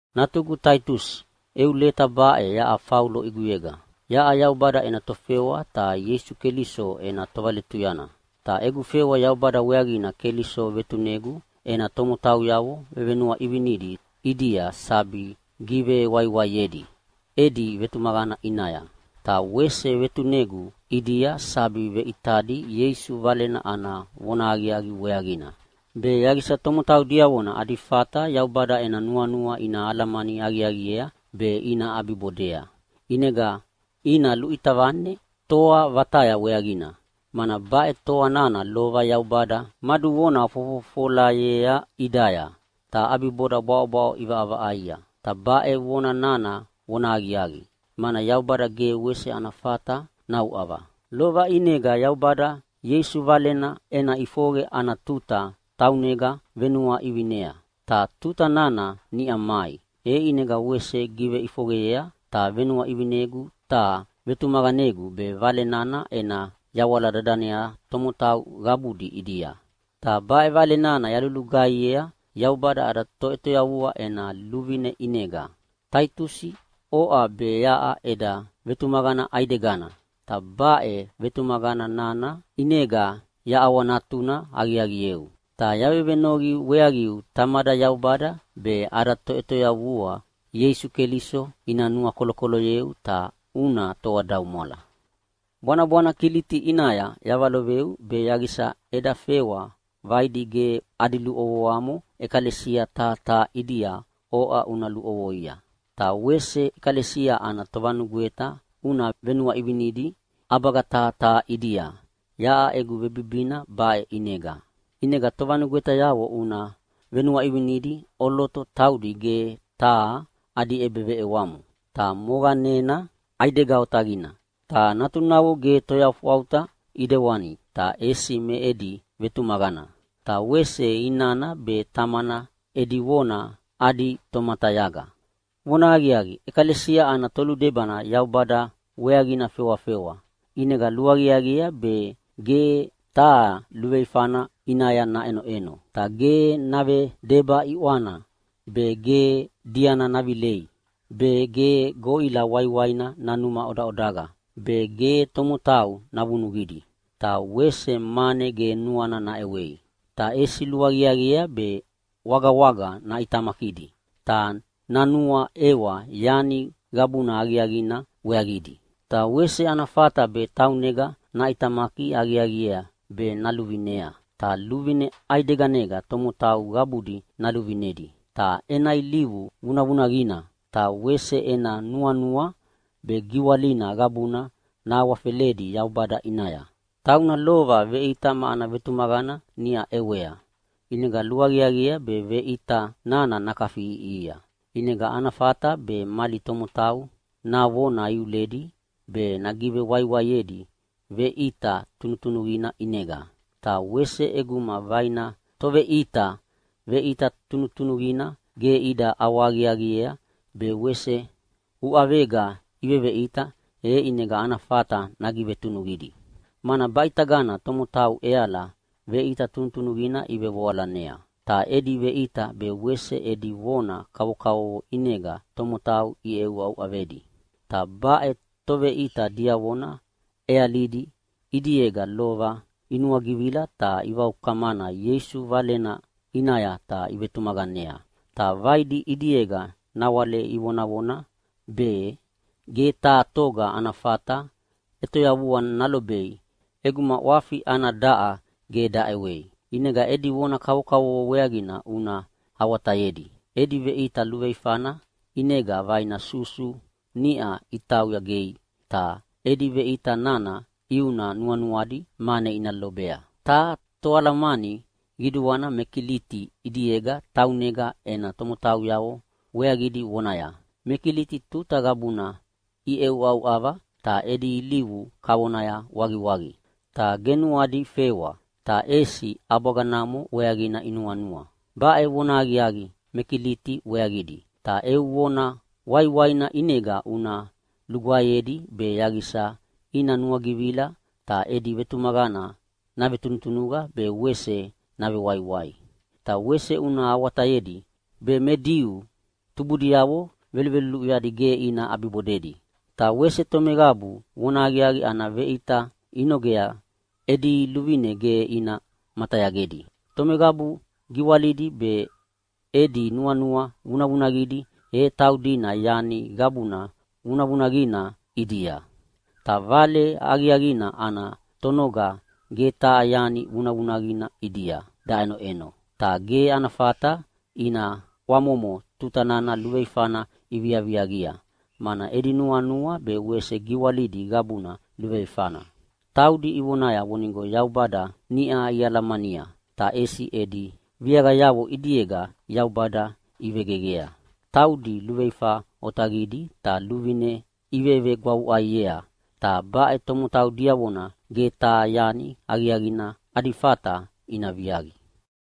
Natugu Taitusi, eu leta baʼe yaʼa Faulo ʼiguyega. Yaʼa Yaubada ena tofewa ta Ieisu Keliso ena tovaletuyana. Ta egu fewa Yaubada weaqina Keliso vetunegu ena tomotauyavo vevenuaʼivinidi ʼidia sabi givewaiwaiedi edi vetumaqana ʼinaya. Ta wese vetunegu ʼidia sabi veʼitadi Ieisu Valena ana vonahaqiaqi weaqina, be yaqisa tomotau diavona adi fata Yaubada ena nuanua ina alamani aqiaqiea be ina ʼabibodea. ʼInega ina luʼita vane toa vataya weaqina, mana baʼe toa nana lova Yaubada maduvona fofofolayea ʼidaya, ta ʼabiboda bwaʼobwaʼo ʼivaʼavaʼaia. Ta baʼe vona nana vonahaqiaqi, mana Yaubada ge wese ana fata nauʼava! Lova ʼinega Yaubada Ieisu Valena ena ʼifoqe ana tuta taunega venuaʼivinea. Ta tuta nana niʼa mai, e ʼinega wese giveʼifoqeyea, ta venuaʼivinegu ta vetumaqanegu be Vale nana ena yawala dadanea tomotau qabudi ʼidia. Ta baʼe Vale nana yalulugaihiea Yaubada ada Toʼetoyavua ena luvine ʼinega. Taitusi, oʼa be yaʼa eda vetumaqana ʼaidegana, ta baʼe vetumaqana nana ʼinega yaʼawanatuna aqiaqieu. Ta yavevenoqi weaqiu Tamada Yaubada be ada Toʼetoyavua Ieisu Keliso ina nuakolokoloyeu ta una toadaumwala. Bwanabwana Kiliti ʼinaya yavaloveu be yaqisa eda fewa vaidi ge adi luʼovoamo ʼekalesia taha taha ʼidia oʼa una luʼovoia. Ta wese ʼekalesia ana tovanugweta una venuaʼivinidi ʼabaga taha taha ʼidia yaʼa egu vebibina baʼe ʼinega. ʼInega tovanugwetayavo una venuaʼivinidi ʼoloto taudi ge taha adi ʼebeveʼewamo. Ta moqanena ʼaidega otaqina, ta natunavo ge toyafwauta ʼidewani ta ʼesi me edi vetumaqana, ta wese inana be tamana edi vona adi tomatayaga. Vonahaqiaqi, ʼekalesia ana toludebana Yaubada weaqina fewafewa, ʼinega luaqiaqiea be ge taha luveifana ʼinaya naʼenoʼeno. Ta ge navedeba ʼiʼwana be, ge diana navilei be, ge goʼila waiwaina nanuma ʼodaʼodaqa be, ge tomotau navunuqidi ta wese mane ge nuana naʼewei. Ta ʼesi luaqiaqiea be wagawaga naʼitamakidi, ta nanuaʼewa yani qabuna aqiaqina weaqidi. Ta wese ana fata be taunega naʼitamaki aqiaqiea be naluvinea, ta luvine ʼaideganega tomotau qabudi naluvinedi, ta ena ilivu vunavunaqina, ta wese ena nuanua be giwalina qabuna nahawafeledi Yaubada ʼinaya. Tauna lova veʼita ma ana vetumaqana niʼa ʼewea, ʼinega luaqiaqiea be veʼita nana nakafiʼiʼihia, ʼinega ana fata be mali tomotau navona iuledi be nagivewaiwaiedi veʼita tunutunuqina ʼinega. Ta wese ʼeguma vaina toveʼita veʼita tunutunuqina ge ida ʼawahaqiaqiea be wese uʼavega iveveʼita, e ʼinega ana fata nagivetunuqidi. Mana baʼitagana tomotau ʼeala veʼita tunutunuqina ivevoalanea, ta edi veʼita be wese edi vona kavokavovo ʼinega tomotau iʼeʼeuʼauʼavedi. Ta baʼe toveʼita diavona ʼealidi ʼidiega lova inuagivila ta ivaukamana Ieisu Valena ʼinaya ta ivetumaqanea. Ta vaidi ʼidiega nawale ivonavona be ge taha toga ana fata ʼetoyavua nalobei ʼeguma ʼwafi ana daʼa ge daʼewei. ʼInega edi vona kavokavovo weaqina una awatayedi. Edi veʼita luveifana ʼinega vaina susu niʼa itauya gei, ta edi veʼita nana ʼiuna nuanuadi mane ina lobea. Taha toalamani qiduana me Kiliti ʼidiega taunega ena tomotauyavo weaqidi vonaya, “Me Kiliti tuta qabuna iʼeʼeuʼauʼava, ta edi ilivu kavona waqiwaqi, ta ge nuadi fewa, ta ʼesi ʼabwaga namo weaqina inuanua”. Baʼe vonahaqiaqi me Kiliti weaqidi, ta eu vona waiwaina ʼinega una lugwaeyedi be yaqisa ina nuagivila ta edi vetumaqana navetunutunuqa be wese navewaiwai. Ta wese una awatayedi be me Diu tubudiavo veluluʼuyadi ge ina ʼabibodedi, ta wese tomeqabu vonahaqiaqi ana veʼita inogea edi luvine ge ina matayagedi. Tomeqabu giwalidi be edi nuanua vunavunaqidi, e taudina yani qabuna vunavunaqina ʼidia. Ta Vale Aqiaqina ana tonoga ge taha yani vunavunaqina ʼidia daʼenoʼeno, ta ge ana fata ina ʼwamomo tuta nana luveifana iviaviaqia, mana edi nuanua be wese giwalidi qabuna luveifana. Taudi ivonaya vonigo Yaubada niʼa ialamania, ta ʼesi edi viaqayavo ʼidiega Yaubada ivegeqea. Taudi luveifa otaqidi ta luvine ivevegwavuʼaiea, ta baʼe tomotau diavona ge taha yani aqiaqina adi fata ina viaqi.